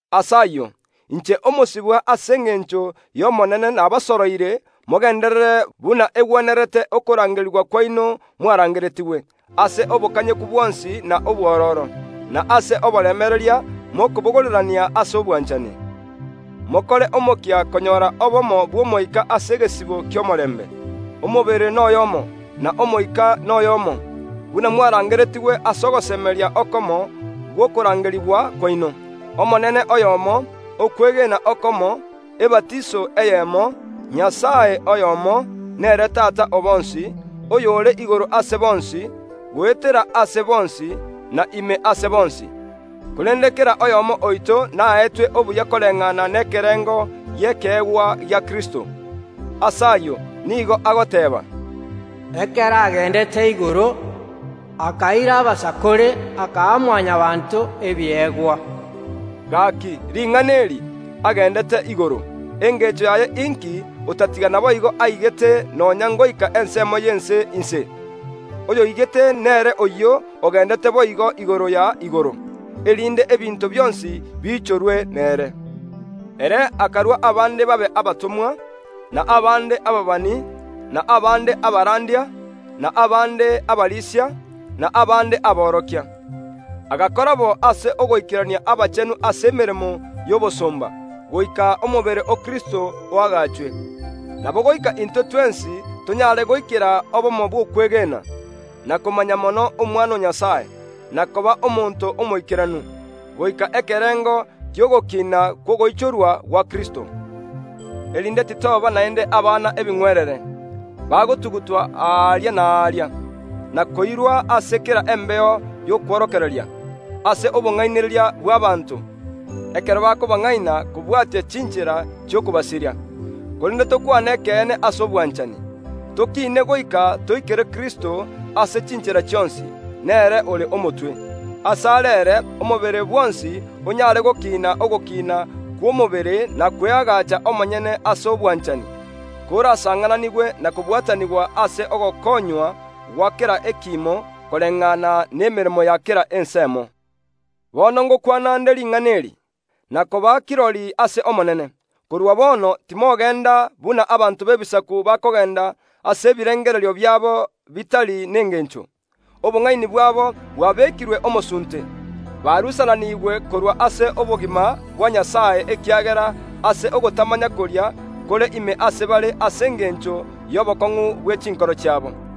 Ase ayio, inche omosibwa ase engencho y’Omonene nabasoroire mogenderere buna egwenerete okorangerigwa kwaino mwarangereretigwe ase obokanyeku bwonsi na obwororo, na ase oboremereria mokobogorerania ase obwanchani. Mokore omokia konyora obomo bw’Omoika ase egesibo ki’omorembe. Omobere n’oyoomo, na Omoika n’oyoomo, buna mwarangeretigwe ase ogosemeria okomo gw’okorangerigwa kwaino. Omonene oyomo, okwegena okomo, ebatiso eyemo, Nyasae oyomo, ore Tata o bonsi, ere ore igoro ase bonsi, goetera ase bonsi, na ime ase bonsi. Korende kera oyomo oito naetwe obuya koreng’ana n’ekerengo gi’ekeegwa gia Kristo. Ase ayio nigo agoteeba. “Ekero ageendete igoro, akaira abasakore, akaa Mwanyabaanto ebiegwa.” (Gaki, ring’ana eri, “Ageendete igoro”, engencho yaye inki otatiga naboigo aigete nonya ngoika ensemo yainse y’ense? Oyoigete nere oyio ogendete boigo igoro ya igoro, erinde ebinto bionsi biichorwe nere.) Ere akarua abande babe abatomwa, na abande ababani, na abande abarandia, na abande abarisia, na abande aboorokia. Agakora bo ase ogoikerania abachenu ase emeremo y’obosomba, goika omobere o Kristo oagachwe. Nabo goika intwe twensi tonyaare goikera obomo bw’okwegena, na komanya mono Omwana o Nyasae, na koba omonto omoikeranu, goika ekerengo ki’ogokiina kw’ogoichorwa gwa Kristo; erinde titoba naende abana ebing’werere, bagotumatumigwa aaria na aaria, na koirurukigwa ase kera embeo y’okworokereria, ase obong’ainereria bw’abaanto, ekero bakobang’aina kobwatia chiinchera chi’okobasiria. Korende tokwane ekeene ase obwanchani, tokiine goika toikere Kristo ase chiinchera chionsi; nere ore omotwe. Ase are ere omobere bwonsi onyare gokiina ogokiina kw’omobere na kweagaacha omonyene ase obwanchani, korasang’ananigwe na kobwatanigwa ase ogokoonywa gwa kera ekiimo koreng’ana n’emeremo ya kera ensemo. Bono ’ngokwana nde ring’ana eri, na koba kirori ase Omonene; korwa bono timogeenda buna abanto b’Ebisaku bakogeenda ase ebirengorerio biabo bitari nengeencho. Obong’aini bwabo bwabekirwe omosunte, barusananiigwe korwa ase obogima bwa Nyasae ekiagera ase ogotamanya koria kore ime ase bare ase engencho y’obokong’u bwe chinkoro chiabo.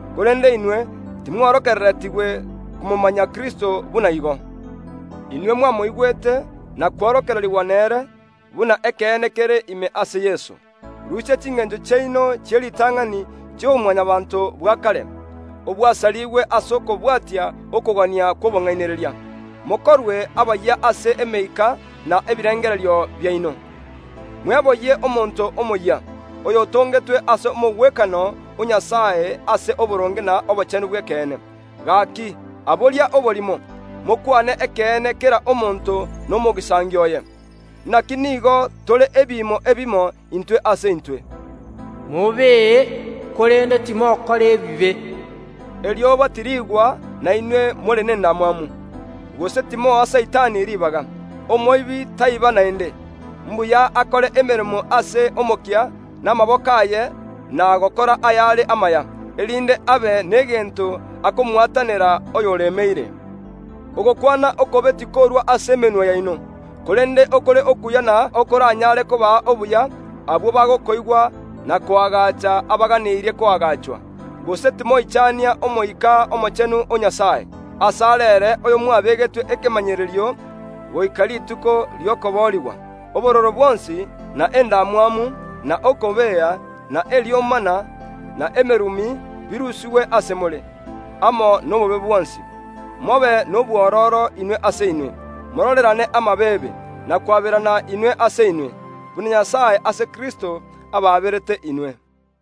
Korende inwe timworokereretigwe komomanya Kristo ase enchera eyio. Inwe mwamoigwete na kworokererigwa nere, buna ekeene kere ime ase Yeso. Rusia chingeencho chiaino chi’eritang’ani chi’oboMwanyabaanto bwa kare, obwasariigwe ase okobwatia okogania kw’obong’ainereria; mokorwe abayia ase emeika na ebirengererio biaino, mweboyie omonto omoyia, oyotongetwe ase omogwekano o Nyasae ase oboronge na obochenu bw’ekeene. Gaki aboria oborimo, mokw’ane ekeene kera omonto nomogisangio oye, inaki nigo tore ebiimo ebimo intwe ase intwe. Mobee, korende timokora ebibe; erioba tiriigwa na inwe more n’endamwamu, gose timoa Saitani ribaga. Omoibi taiba naende; mbuya akore emeremo ase omokia namaboko aye na gokora ayare amaya, erinde abe negento akomwatanera oyoremeire. Ogokwana okobe tikorua ase emenwa yaino, korende okore okuya na okoranyaare kobaa obuya abwo bagokoigwa na koagaacha abaganeirie koagaachwa. Gose timoichania Omoika Omochenu o Nyasae, ase are ere oyomwabegetwe ekemanyererio goika rituko ri’okoboorigwa. Obororo bwonsi, na endamwamu, na okobea, na eriomana, na emerumi birusigwe ase more, amo n’obobe bwonsi. Mobe nobwororo inwe ase inwe, mororerane amabeebe, na kwaberana inwe ase inwe, buna Nyasae ase Kristo abaaberete inwe.